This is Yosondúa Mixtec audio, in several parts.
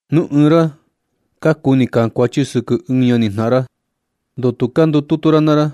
Nu ɨɨn ra kuni kankuachi sɨkɨ ɨɨn ñanijnaꞌan ra, ¿Ndoo tu ka ndututu ra naa ra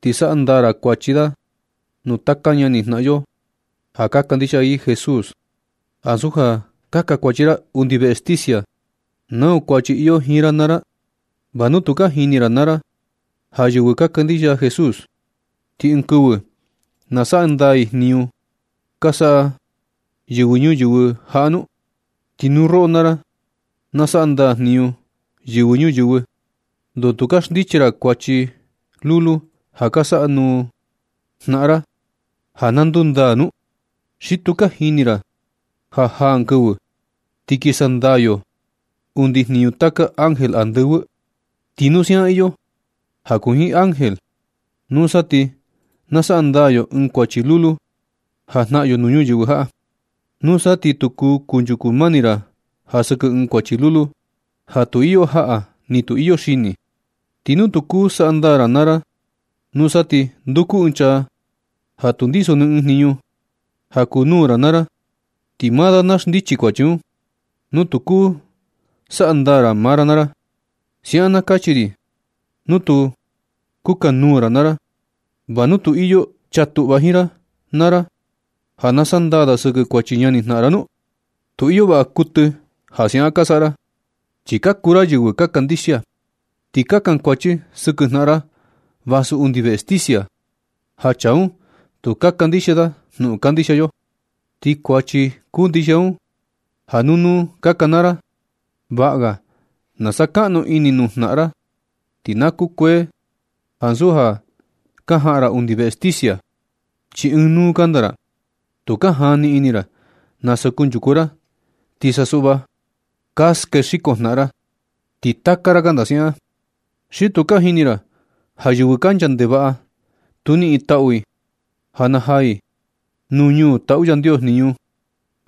ti saꞌa ndaa ra kuachi da nuu taka ñani jnaꞌan yo ja ka kandixia i Jesús ansu ja kankuachi ra undi veꞌe sticia nau kuachi iyo jiin ra naa ra? ¿Va nu tu ka jini ra naa ra ja yɨvɨ ka kandixia Jesús, ti ɨɨn kɨvɨ na saꞌa ndaa i jniñu ka saꞌa yɨvɨ ñuyɨvɨ jaꞌa nu? Ti nu roꞌo naa ra na saꞌa ndaa jniñu yɨvɨ ñuyɨvɨ, ¿ndoo tu ka xndichi ra kuachi lulu ja ka saꞌa nuu jnaꞌan ra ja na ndundaa nu? ¿Xi tu ka jini ra ja jaa ɨɨn kɨvɨ ti kin sandaa yo undi jniñu taka ángel andɨvɨ? Ti nu siaꞌan iyo ja kuu jiin ángel, nusa ti na saꞌa ndaa yo ɨɨn kuachi lulu ja jnaꞌan yo nuu ñuyɨvɨ jaꞌa. Nusa ti nu tu kanchuku mani ra ja sɨkɨ ɨɨn kuachi lulu ja tu iyo jaꞌa ni tu iyo xini, ti nu tu kuu saꞌa ndaa maa ra naa ra, nusa ti nduku ɨɨn chaa ja tu ndiso ni ɨɨn jniñu ja kuu nuu ra naa ra, ti maa da na xndichi kuachi un, nu tu kuu saꞌa ndaa maa ra naa ra. Siaꞌan na kachi ri nu tu kukanuu ra naa ra. ¿Va nu tu iyo chaa tuꞌva jiin ra naa ra ja na sandaa da sɨkɨ kuachi ñanijnaꞌan da nu? Tu iyo vaꞌa kuɨtɨ ja siaꞌan ka saꞌa ra, chi ka kuu ra yɨvɨ ka kandixia, ti ka kankuachi sɨkɨ jnaꞌan ra vasu undi veꞌe sticia, ja chaa un tu ka kandixia da jnuꞌun kandixia yo. Ti kuachi kuu ndixia un ja nuu nuu ka kanaa ra. Vaꞌa ga na sakaꞌnu ini nuu jnaꞌan ra ti na kukuee ni ansu ja ka jaꞌan ra undi veꞌe sticia, chi ɨɨn nuu kanda ra. Tu ka jani ini ra nasa kunchuku ra ti sa suꞌva ka skexiko jnaꞌan ra, ti taka ra kanda siaꞌan. ¿Xi tu ka jini ra ja yɨvɨ kancha ndevaꞌa, tu niꞌin taꞌu i ja na jaa i ñuu nuu taꞌu Yandios jniñu?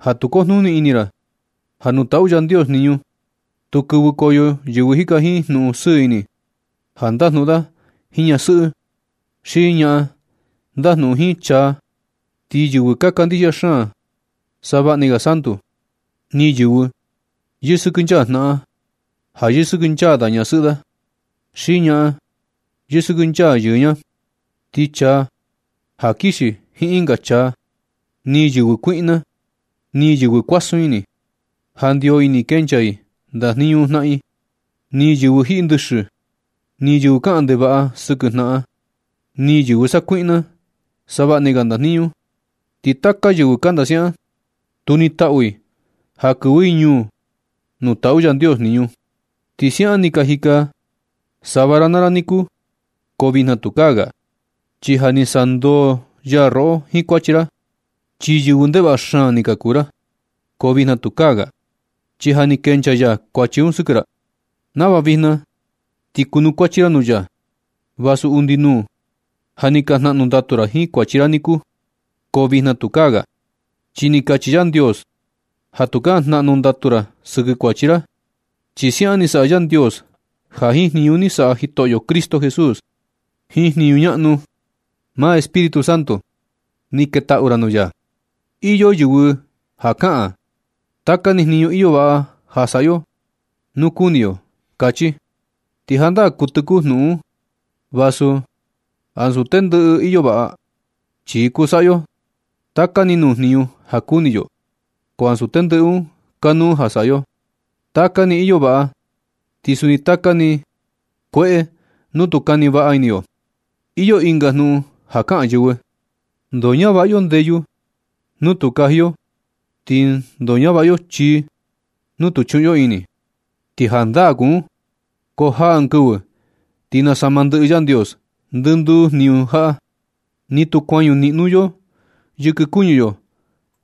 Ja tu kujnuni ini ra ja nuu taꞌu Yandios jniñu, tu kɨvɨkoyo yɨvɨ jika jiin jnuꞌun sɨɨ ini ja ndajnuꞌun da jiin ñasɨꞌɨ, xi ñaꞌan ndajnuꞌun jiin chaa, ni yɨvɨ ka kandixia xaan savaꞌni ga santu, ni yɨvɨ yɨsɨkɨnchaa jnaꞌan ja yɨsɨkɨnchaa da ñasɨꞌɨ da, xi ñaꞌan yɨsɨkɨnchaa yɨɨ ña, ni chaa ja kixi jiin ɨnga chaa, ni yɨvɨ kuiꞌna, ni yɨvɨ kuasun ini, ja ndio ini kenchaa i ndajniñu jnaꞌan i, ni yɨvɨ jiꞌi ndɨxɨ, ni yɨvɨ kaꞌan ndevaꞌa sɨkɨ jnaꞌan, ni yɨvɨ sakuiꞌna savaꞌni ga ndajniñu. Ti taka yɨvɨ kanda siaꞌan, tu nitaꞌu i ja kɨvɨ i ñuu nuu taꞌu Yandios jniñu. Ti siaꞌan ni ka jika sava ra naa ra niku, ko vijna tukaa ga. Chi ja ni saꞌa ndoo ya roꞌo jiin kuachi ra. Chi yɨvɨ ndevaꞌa xaan ni ka kuu ra, ko vijna tukaa ga, chi ja ni kenchaa ya kuachi un sɨkɨ ra, nava vijna ti kunukuachi ra nuu ya, vasu undi nuu ja ni ka jnaꞌnu ndatu ra jiin kuachi ra niku. Ko vijna tukaa ga, chi ni kachi Yandios ja tukaa jnaꞌnu ndatu ra sɨkɨ kuachi ra. Chi siaꞌan ni saꞌa Yandios ja jiin jniñu ni saꞌa Jitoꞌyo Cristo Jesús, jiin jniñu ñaꞌnu maa Espíritu Santo ni ketaꞌu ra nuu ya. Iyo yɨvɨ ja kaꞌan: “Taka ni jniñu iyo vaꞌa ja saꞌa yo nu kuni yo”, kachi. Ti jandaa kuɨtɨ kuu jnuꞌun un, vasu ansu tendɨꞌɨ iyo vaꞌa, chi kuu saꞌa yo taka ni nuu jniñu ja kuni yo, ko ansu tendɨꞌɨ un kanuu ja saꞌa yo. Taka ni iyo vaꞌa, ti suni taka ni kueꞌe nu tu kani vaꞌa ini yo. Iyo ɨnga jnuꞌun ja kaꞌan yɨvɨ: ¿Ndoo ñavaꞌa yo ndeyu nu tu kaji yo ti ndoo ñavaꞌa yo chii nu tu chuꞌun yo ini? Ti jandaa kuu un, ko jaa ɨɨn kɨvɨ ti nasama ndɨꞌɨ Yandios ndɨnduu jniñu jaꞌa. Ni tu kuañu niꞌno yo yɨkɨ kuñu yo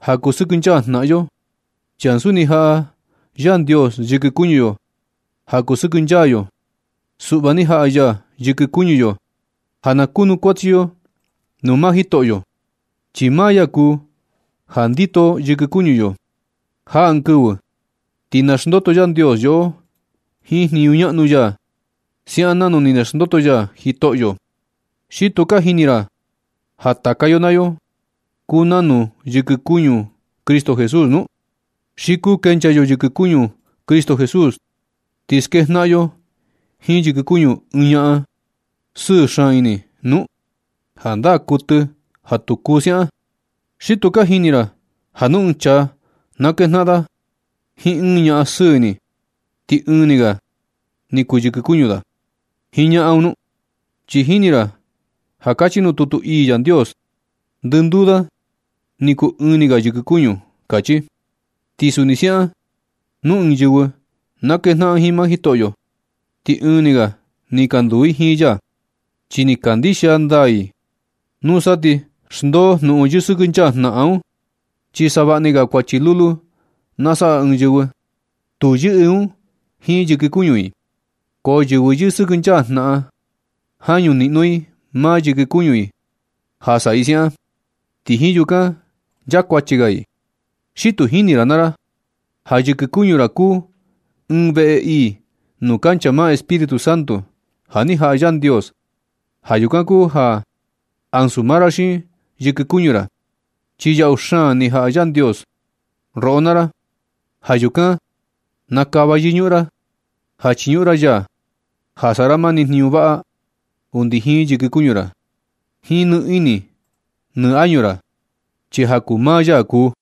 ja kusɨkɨnchaa jnaꞌan yo, chi ansu ni jaꞌa Yandios yɨkɨ kuñu yo ja kusɨkɨnchaa yo. Suꞌva ni jaꞌa ya yɨkɨ kuñu yo ja na kunukuachi yo nuu maa Jitoꞌyo. Chi maa ya kuu ja ndito yɨkɨ kuñu yo. Jaa ɨɨn kɨvɨ ti naxndoto Yandios yoꞌo jiin jniñu ñaꞌnu ya siaꞌan nanu ni naxndoto ya Jitoꞌyo. ¿Xi tu ka jini ra ja taka yo naa yo kuu nanu yɨkɨ kuñu Cristo Jesús nu? ¿Xi kuu kenchaa yo yɨkɨ kuñu Cristo Jesús ti skejnaꞌan yo jiin yɨkɨ kuñu ɨɨn ñaꞌan sɨɨ xaan ini nu? ¡Jandaa kuɨtɨ ja tu kuu siaꞌan! ¿Xi tu ka jini ra ja nu ɨɨn chaa na kejnaꞌan da jiin ɨɨn ñaꞌan sɨɨ xaan ini ti ɨɨn ni ga ni kuu yɨkɨ kuñu da jiin ñaꞌan un nu? Chi jini ra ja kachi nuu tutu ii Yandios: “Ndɨnduu da ni kuu ɨɨn ni ga yɨkɨ kuñu”, kachi. Ti suni siaꞌan nu ɨɨn yɨvɨ na kejnaꞌan jiin maa Jitoꞌyo, ti ɨɨn ni ga ni nduu i jiin ya, chi ni kandixia ndaa i. Nusa ti xndoo jnuꞌun yɨsɨkɨnchaa jnaꞌan un, chi savaꞌni ga kuachi lulu na saꞌa ɨɨn yɨvɨ, tu yɨꞌɨ un jiin yɨkɨ kuñu i, ko yɨvɨ yɨsɨkɨnchaa jnaꞌan, jañu niꞌno i maa yɨkɨ kuñu i ja saꞌa i siaꞌan, ti jiin yukan nchaa kuachi ga i. ¿Xi tu jini ra naa ra ja yɨkɨ kuñu ra kuu ɨɨn veꞌe ii nuu kancha maa Espíritu Santo ja ni jaꞌa Yandios? Ja yukan kuu ja ansu maa ra xiin yɨkɨ kuñu ra, chi yaꞌu xaan ni jaꞌa Yandios roꞌo naa ra. Ja yukan na kava yɨñuꞌun ra ja chiñuꞌun ra ya ja saꞌa ra mani jniñu vaꞌa undi jiin yɨkɨ kuñu ra, jiin nɨ ini nɨ añu ra, chi ja kuu maa ya kuu.